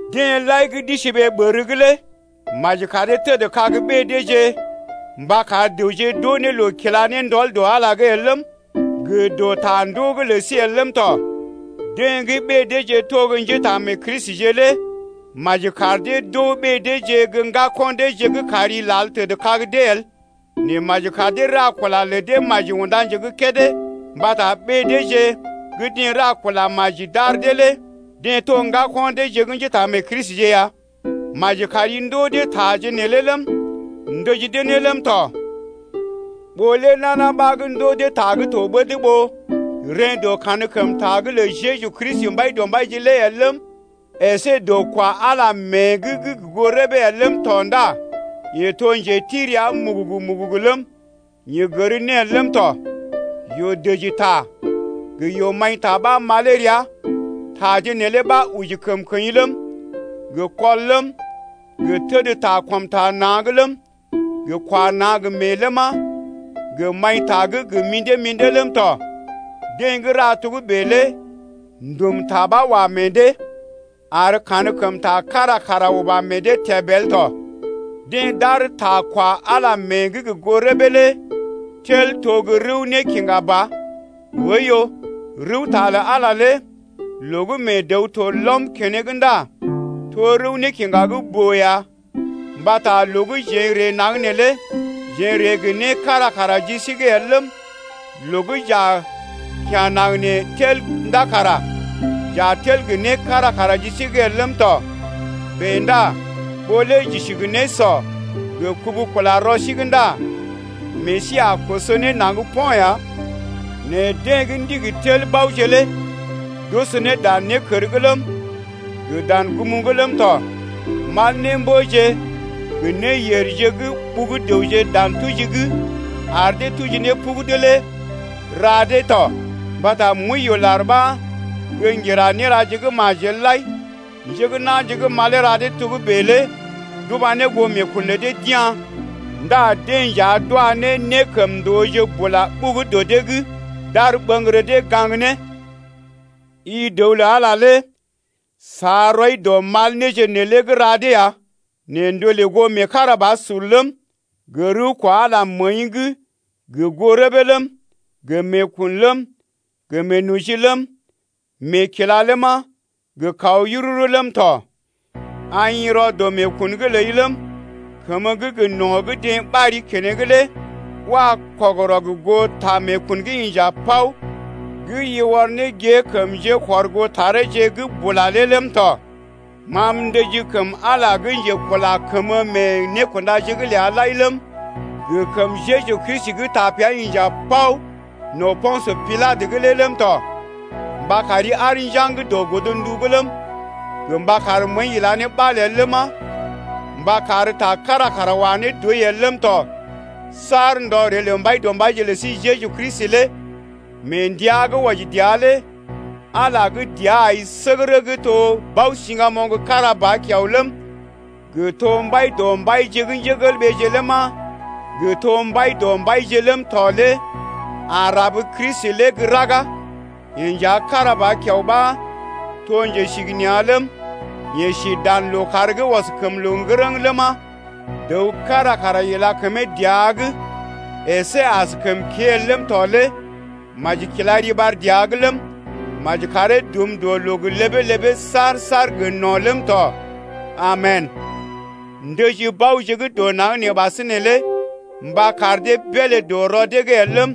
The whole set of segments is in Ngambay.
Deḛ lai gə́ d’isi ɓee ɓər’g lé maji kar dee tədkag ɓée deeje mba kar dəwje d’oo ne loo kila ne ndɔl dɔ Ala el ləm, gə dɔ ta ndoo’g lə sí el ləm tɔ. Deḛ gə́ ɓée deeje to gə́ njétaamee-Kristije lé maji kar dee d’oo ɓée deeje gə́ ŋgako̰ deeje gə́ kari lal təd ne kag dee el. Nɛ maji kar dee ra kula lə dee maji unda nje gə́ kédé mbata ɓée deeje gə́ deḛ ra kula maji d’ar dee lé deḛ to ŋgako̰ deeje gə́ njétaamee-Kristije ya. Maji kari ndoo dee taje neelé ləm, ndəji dee ne ləm tɔ. Ɓó lé nana ɓa ndoo dee ta gə́ to ɓəd ɓó reḛ́ dɔ kankəmta’g lə Jeju Kristi Mbaidɔmbaije lé el ləm, əsé dɔ kwa Ala mée’g gə goo rəbee el ləm tɔ ndá yeḛ to njeti rəa mugugu-mugugu ləm, yeḛ gər né el ləm tɔ. Yoo-dəji ta gə yoo-maḭta ɓa malee rəa. Taje neelé ɓa oji kəmkəḭ ləm, gə kɔl ləm, gə təd ta kɔm ta na̰’g ləm, gə kwa na̰ gə meḛ ləma, gə maḭta gə́ gə mḭdé-mḭdé ləm tɔ. Deḛ gə́ ra togə́bè lé ndum ta ɓa wa meḛ dee, ar kankəmta kára kara uba meḛ dee təb el tɔ, dee tel ta kwa Ala mée’g gə goo rəbee lé tel to gə́ rəw nékiŋga ba. Oiyo, rəwta lə Ala lé loo gə́ mee dəw to lɔm keneŋ ndá to rəw nékiŋga gə́ boo ya. Mbata loo gə́ jeḛ n’ree naŋg neelé jeḛ n’ree gə né kára kara ji sí’g el ləm, loo gə́ j’a kya̰ naŋg nee tel ndá kara j’a tel gə né kára kara ji sí’g el ləm tɔ. Bèe ndá ɓó lé j’isi gə nésɔ gə kubu kula rɔ sí’g ndá meḛ sí a koso ne naŋg po̰ ya. Nɛ deḛ gə́ ndigi tel baoje lé d’oso ne dan nékər’g ləm, gə dan gum’g ləm tɔ, mal némbəje gə néyèrje gə́ ɓugu dəwje dan tuji’g ar dee tuji ne pugudu lé ra dee tɔ. Mbata mwəiyoolar ɓa gə́ ŋgira néraje gə́ majel lai. Njé gə́ na̰je gə́ malee ra dee togə́bè lé d’uba ne goo meekun lə dee d’ya̰ ndá deḛ nja d’wa ne nékəmndooje bula ɓugu dɔ dee’g d’ar ɓəŋgərə dee gaŋg ne. I dəw lə Ala lé sa rɔi dɔ mal néje neelé gə́ ra dee ya nɛ ndolè goo meekarabasur ləm, gə rəw kwa Ala məəi’g gə goo rəbee ləm, gə meekun ləm, gə meenoji ləm, gə meekila ləma, gə kaw yururu ləm tɔ. Aḭ rɔ dɔ meekun’g ləi ləm, kəmə gə́ gə no̰ gə́ deḛ ɓari keneŋ lé wa kɔgərɔ gə goo ta meekun gə́ inja bao gə́ i ɔr ne gée kəm njékɔrgootareeje’g bula lé ləm tɔ. Ma m’ndəjii kəm Ala gə́ njekula kəmə mee nékundaje’g ləa lai ləm, gə kəm Jeju Kristi gə́ tapea inja paw no̰ Po̰sə Pilatə’g lé ləm tɔ mba kari aar njaŋg dɔ godndu’g ləm, gə mba kar məəi ila ne ɓal el ləma, mba kar ta kára kara wa ne dɔi el ləm tɔ, saar ndɔ ree lə Mbaidɔmbaije lə sí Jeju Kristi lé. Mee ndəa gə́ wɔji dəa lé Ala gə́ dəa ai səgərə gə́ to Bao-siŋgamoŋ kára ba kiao ləm, gə to Mbai dɔ mbaije ləma, gə to Mbaidɔmbaije ləm tɔ lé a rab Kristi lé gə́ raga. Yeḛ nja kára ba kiao ɓa to Njesigənea̰ ləm, yeḛ si dan lookàr gə́ ɔs kəm loo ŋgərəŋ ləma, dəw kára kara ila kəmee dəa’g əsé askəm kée el ləm tɔ lé maji kila riɓar dəa’g ləm, maji karee dum dɔ loo gə ləbee-ləbee saar-saar gə no̰ ləm tɔ. Amen! Ndəji baoje gə́ dɔ naŋg nee ɓasinè lé mba kar dee beelé dɔ rɔ dee’g el ləm,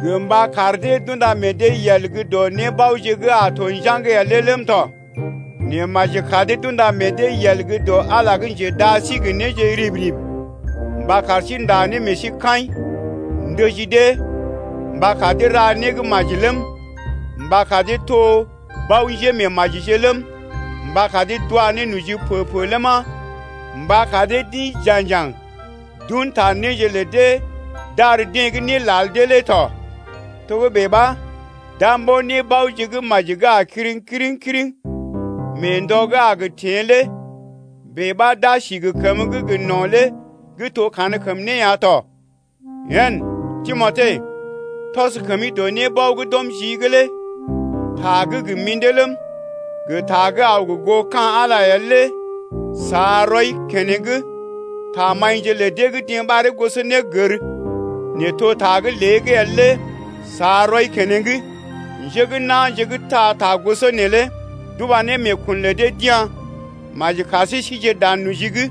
gə mba kar dee d’unda meḛ dee yel gə́ dɔ nébaoje gə́ a gə to njaŋg el lé el ləm tɔ. Nɛ maji kar dee d’unda meḛ dee yel gə́ dɔ Ala lé gə́ njedaa sí gə néje rib-rib mba kar sí ndá ne meḛ sí kaḭ. Ndəji dee mba kar dee ra né gə́ maji ləm, mba kar dee to bao-njémeemajije ləm, mba kar dee d’wa ne noji pə-pə ləma, mba kar dee d’ḭ ja̰jaŋ d’un ne ta néje lə dee d’ar deḛ gə́ né lal dee lé tɔ. Togə́bè ɓa, d’a mbo̰ nébaoje gə́ maji gə́ a kiriŋ kiriŋ-kiriŋ mee ndɔ gə́ a gə teḛ lé, bèe ɓa, d’a si gə kəməgə́ gə no̰ lé gə́ to kankəm né ya tɔ. Yen Timote, tɔs kəmi dɔ nébao gə́ d’ɔm jii’g lé, ta gə́ gə mḭdé ba ləm, gə ta gə́ aw gə goo ka̰ Ala lé el lé sa rɔi keneŋ. Tamaḭje lə dee gə́ deḛ ɓaree gosonégər, nɛ to ta gə́ lée’g el lé sa rɔi keneŋ. Njé gə́ na̰je gə́ taa ta goso neelé d’uba ne meekun lə dee d’ya̰. Maji kar sí sije dan noji’g!